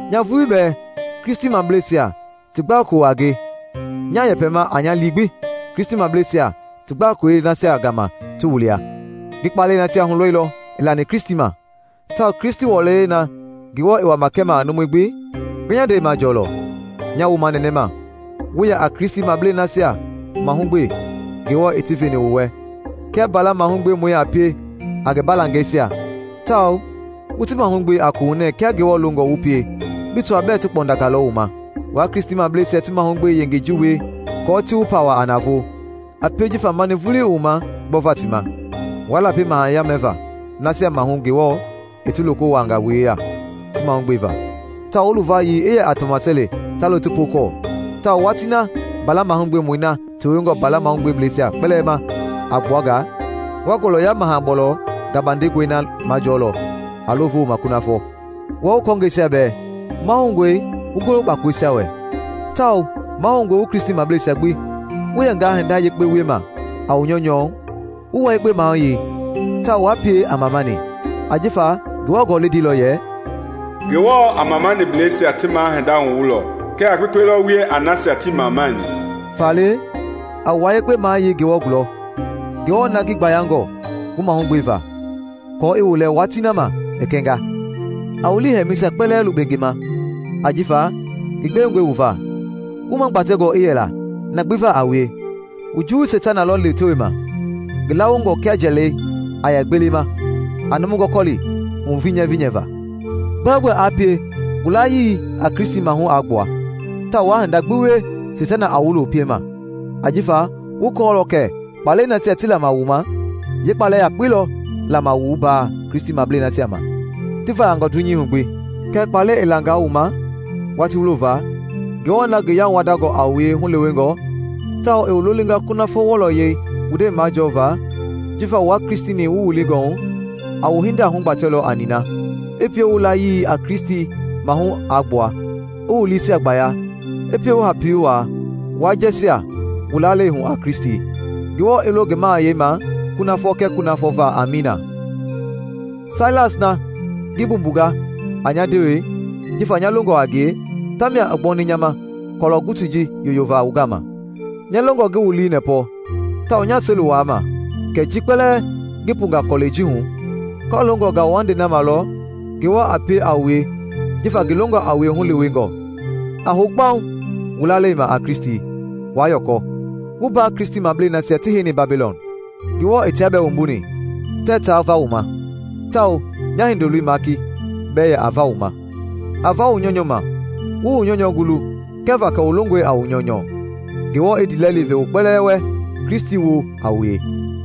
Nya vulii bɛɛ Kristimableisia ti gbakolo a nge, nyaa yɛpɛma a nya lii gbi Kristimableisia ti gbakolei nasia gama ti wu lia. Ngi kpaalɛi nasia hulɔilɔ i lani Kristi ma, tawao Kristi wɔlɔyɛi na Ngewɔ i wama kɛma a numui gbi, nga nya ndɛi majɔɔlɔ. Nyaa wu manɛnɛma, wu yɛ a Kristimablei nasia mahugbe Ngewɔ i ti veni wu wɛ kia mbala mahugbemɔi a pie a ngi baalangɛisia tawao wu ti mahugbe a koohunɛɛ kia Ngewɔ longɔ wu pie bi tɔaa bɛɛ ti kpɔndangalɔ wu ma. Waa Kristimableisia ti mahugbe yengei ji wie aako ti wu pawa a navoo, a pie jifa mani vulii i wu ma gbɔva ti ma. Waa lapi mahaya mɛva nasia maahu Ngewɔ i ti loko wuaanga wu yeya ti mahugbeva, tawao wu luvayii i yɛ a tɔmaseli ta lo ti pookɔɔ. Tawao watii na Mbala Mahugbemɔi na tewengɔ mbala mahugbeblɛisia kpɛlɛɛ ma a gbua nga, wa ngɔlɔya maha-bɔlɔ gabandengɔi na majɔɔlɔ a lo vooma kunafɔ. Wua wu kɔɔngɛisia bɛɛ, mahoungɔe wu golo kpakoleisia wɛ, tawao mahoungɔe wu Kristimableisia gbi wu yɛngaa hinda yekpe wiema a wu nyɔunyɔ wu wua yekpe mayei tawao waa pie a mamani; ajifa Ngewɔ Gɔlɛi ndeilɔ yɛ, “Ngewɔ a mamaniblɛisia ti ma hindei hunyanilɔ, kɛɛ a kpekpe lɔ wie a nasia tii mamanini.” Faale a wua yekpe mayei Ngewɔ gulɔ, Ngewɔ na ngi gbayangɔ wu mahugbeva, aako i wu lɛ watii na ma i kɛnga. A wu liihɛlɛmɛisia kpɛlɛɛ lukpe ngi ma ajifa ngi gbewengɔi wu va. Wu magbatɛngɔ i yɛla na gbi va a wie! Wu juwui Seitana lɔ lewetewema ngi laawongɔ kia njalɛi a yɛ gbelema a numu gɔkɔli hunyivinyivi va. Gbɛogbɛ aa pie wu layii a Kristi maahu aa gbua, tawao waa hinda gbi wie Seitana a wu lo piema ajifa wu kɔɔlɔ kɛ kpaalɛi nasia ti lama wu ma, yeekpaalɛ yakpei lɔ lama wu mbaa Kristimablei nasia ma ti vayangɔ dunyei hu gbi. Kɛɛ kpaalɛi i langaa wu ma watii wulo va, Ngewɔ na ngi yauwandangɔ a wue hulewengɔ, tawao i wu lolinga kunafɔ wɔlɔyɛi wu ndɛi majɔva jifa wua Kristi-ni wu wilingɔ hu, a wu hinda hugbatɛlɔ a nina, i pie wu layii a Kristi maahu aa gbua, i wu liisia gbaya, i pie wu hapi wuaa, waa jɛɛjia wu lalei hu a Kristi. Ngewɔ i lo ngi mahayɛi ma kunafɔ kɛɛ kunafɔ va! Amiina. Sailas na ngi mbumbunga a nya ndewe jifa nya longɔ a ngie, tamia i gbɔni nya ma kɔlɔ gutui ji yoyova wu gama. Nya longɔ ngi wu lii nɛpɔ tawao nyaa seli wuaama kɛ ji kpɛlɛɛ ngi punga kɔlɛi ji hu kɔloongɔ ngauwandei na ma lɔ Ngewɔ a pie a wue jifa ngi longɔ a wue hulewengɔ. A hou kpaŋ wu lalei ma a Kristi, waa yɔkɔ. Wu mbaa Kristimablei nasia ti heini Babilɔn, Ngewɔ i tia bɛɛ wumbuni, tɛɛ ta va wu ma; tawao nya hindoloi Maaki bɛɛ yɛ a va wu ma. A va wu nyɔunyɔ ma, wu wu nyɔunyɔ gulu kɛva kɛ wu longɔe a wu nyɔunyɔ. Ngewɔ i ndiilɛli ve wu kpɛlɛɛ wɛ Kristi woo a wue.